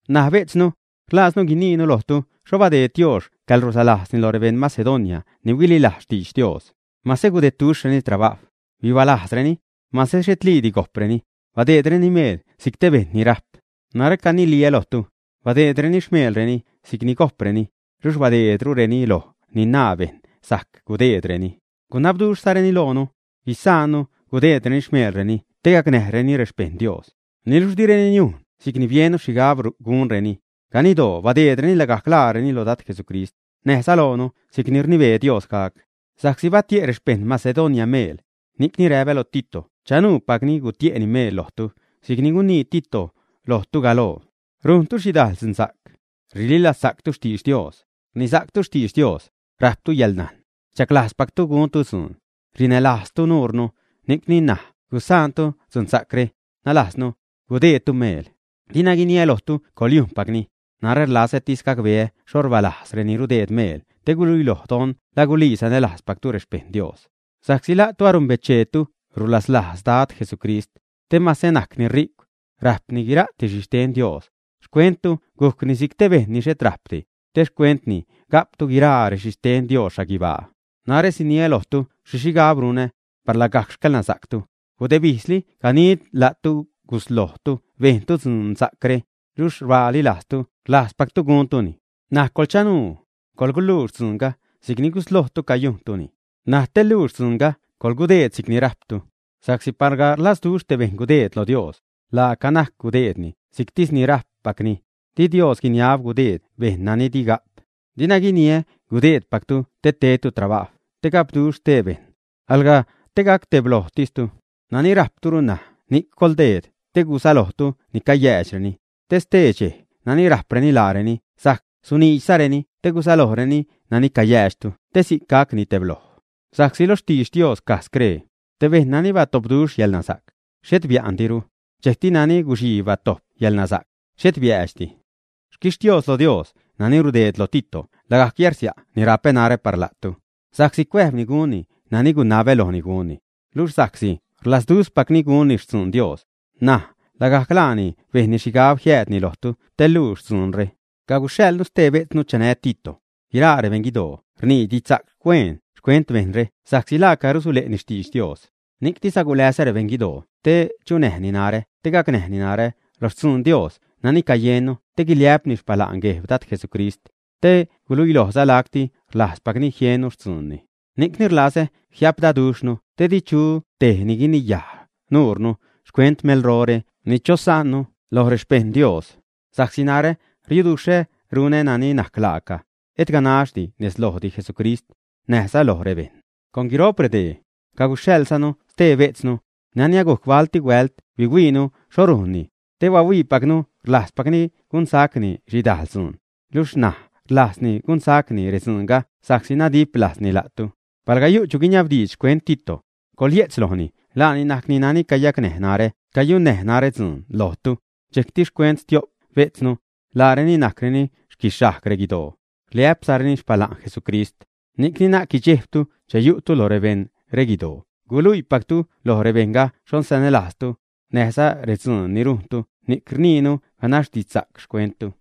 N̲aj bejtznu, rlajznu guiniinu lojtu xho badeed Dios xcäḻrulaslajzni lo rebeṉ Macedonia ni huililajz xtidx Dios. Mase gudedduxhreni trabajw, bibalajzreni, mase xhetliidi gojpreni, badeedreni meel si'c te beṉ ni rajp. Narä caniliä lojtu, badeedreni xmeelreni si'cni gojpreni, luxh badeedrureni loj ni naa bejṉ sajc gudeedreni. Gunabduxhzareni loonu guisaannu gudeedreni xmeelreni te gacnäjreni rexpeṉ Dios. Niluxh direni niujn si'cni biennu xhigab gunreni. Ganiddoo badeedreni lagajc laareni loj Dad Jesucrist, näjza loonu si'cni rnibee Dios gac. Sa'csi batie' rexpeṉ Macedonia meel, ni'c ṉaj räpä loj Tito chanuupacni gutie'ni meel lojtu si'cni gunii Tito lojtu galoo. Rujntu xhidajl dzunsa'c. Rililazsa'ctu xtidx Dios; rnisa'ctu xtidx Dios; rajptu yäḻnajn; rchaglajzpactu guntu dzuun; rinälajztu nuunu, ni'cni na'c gusaantu tedcaj gunzatu dzunsa'cre, nalajznu, gudeedtu meel. Dina guiniä lojtu coḻyujnpacni; narä rlazätis gacbeetu xho rbaalajz reni rudeed meel te guluiloj don la gulii sanälajzpaczatu rexpejṉ Dios. Sa'csi la'tu anumbecheetu rulaslajz Dad Jesucrist, te mase najcni ri'cw, rajpni guiraa xhixten Dios, xcuentu gujcni si'c te bejṉ ni xhet rajpdi, te xcuentni ga'ptu guiraa rexhixten Dios xhaguibaa. Narä siniä lojtu xhi xhigab runä, par lagajc xcäḻnasa'ctu. Gudebijzli ganiid la'tu guslojtu bejntu dzunsa'cre, luxh rbaali lajztu rlajzpactu guntuni. N̲aj coḻchanuu, coḻguluux dzuunga si'cni guslojtu cayujntuni. N̲aj te luux dzuunga coḻgudeed si'cni rajptu. Sa'csi palga rlajzduxh te bejṉ gudeed lo Dios, laaca najc gudeedni si'ctis ni rajppacni. Di Dios guiniab gudeed bejṉ nani dini ga'p. Dina guiniä gudeedtejtu te tedtu trabajw te gapduxh stee bejṉ, alga te gacteblojtistu. Nani rajprulu ṉaj ni'c coḻgudeed te gusalojtu ni cayäädxreni, te stee dxej nani rajpreni laareni sajc suniidxzareni te gusalojreni nani cayäädxtu te si'c gacni tebloj. Sa'csi lo xtidx Dios caj scree: “Te bejṉ nani batopduxh yäḻnasa'c, xhet bia'ndiru, dxejcti nani guxii batojp yäḻnasa'c, xhet biäädxdi.” Xquixtios lo Dios nani rudeed lo Tito lagajc yärsia' ni rapä narä par la'tu. Sa'csi cuäjbni gunni nani gunabä lojni gunni. Luxh sa'csi rlazduxhpacni gunni xtzuun Dios, ṉaj lagajc laani bejnni xhigab jiädhuiini lojtu te luux dzuunre. Caguxhaḻnu xtee bejtznu chanä Tito. Guiraa rebejṉ guidoo rnii didxsa'c hueen xcuent bejṉre sa'csi laaca rusule'ni xtidx Dios. Ni'ctis aguleza rebeṉ guidooni te chunäjni narä te gacnäjni narä lo xtzuun Dios nani cayennu te guiliä'pni xpala'n Gueb Dad Jesucrist, te guluilojza lacti rlajzpacni jiennu xtzuunni. Ni'cni rlazä jiapdaduxhnu te di chu tej ni guiniyaj nuure xcuent melrore ni chosa'nnu lo rexpejṉ Dios. Sa'csi narä riuduxhä runä nani najc laaca, et ganax nez lojdi Jesucrist, näjza loj rebejṉ. Con guiro'p redee, caguxhaḻzanu stee bejtznu, nani agujc balti huält bihuiinu xho rujnni, te bahuiipacnu rlajzpacni gunsa'cni xhidajl dzuun, luxh ṉaj rlajzruni gunsa'cni redzuunga sa'csi nadip lajzni la'tu. Palga yu' chu guiniabdiidx xcuent Tito, coḻyejtz lojni laani najc nani cayunnäj narä dzuun lojtu. Dxejcti xcuent stio'p bejtznu, laareni najcreni xquixhajg reguidoo, rliä'pzareni xpala'n Jesucrist. Ni'c na'c guidxejbtu che yu'tu lo rebejṉ reguidoo guluiipactu loj rebejṉga xho sanälajztu, näjza redzuun ni rujntu ni'c rniinu ganax didxsa'c xcuenttu.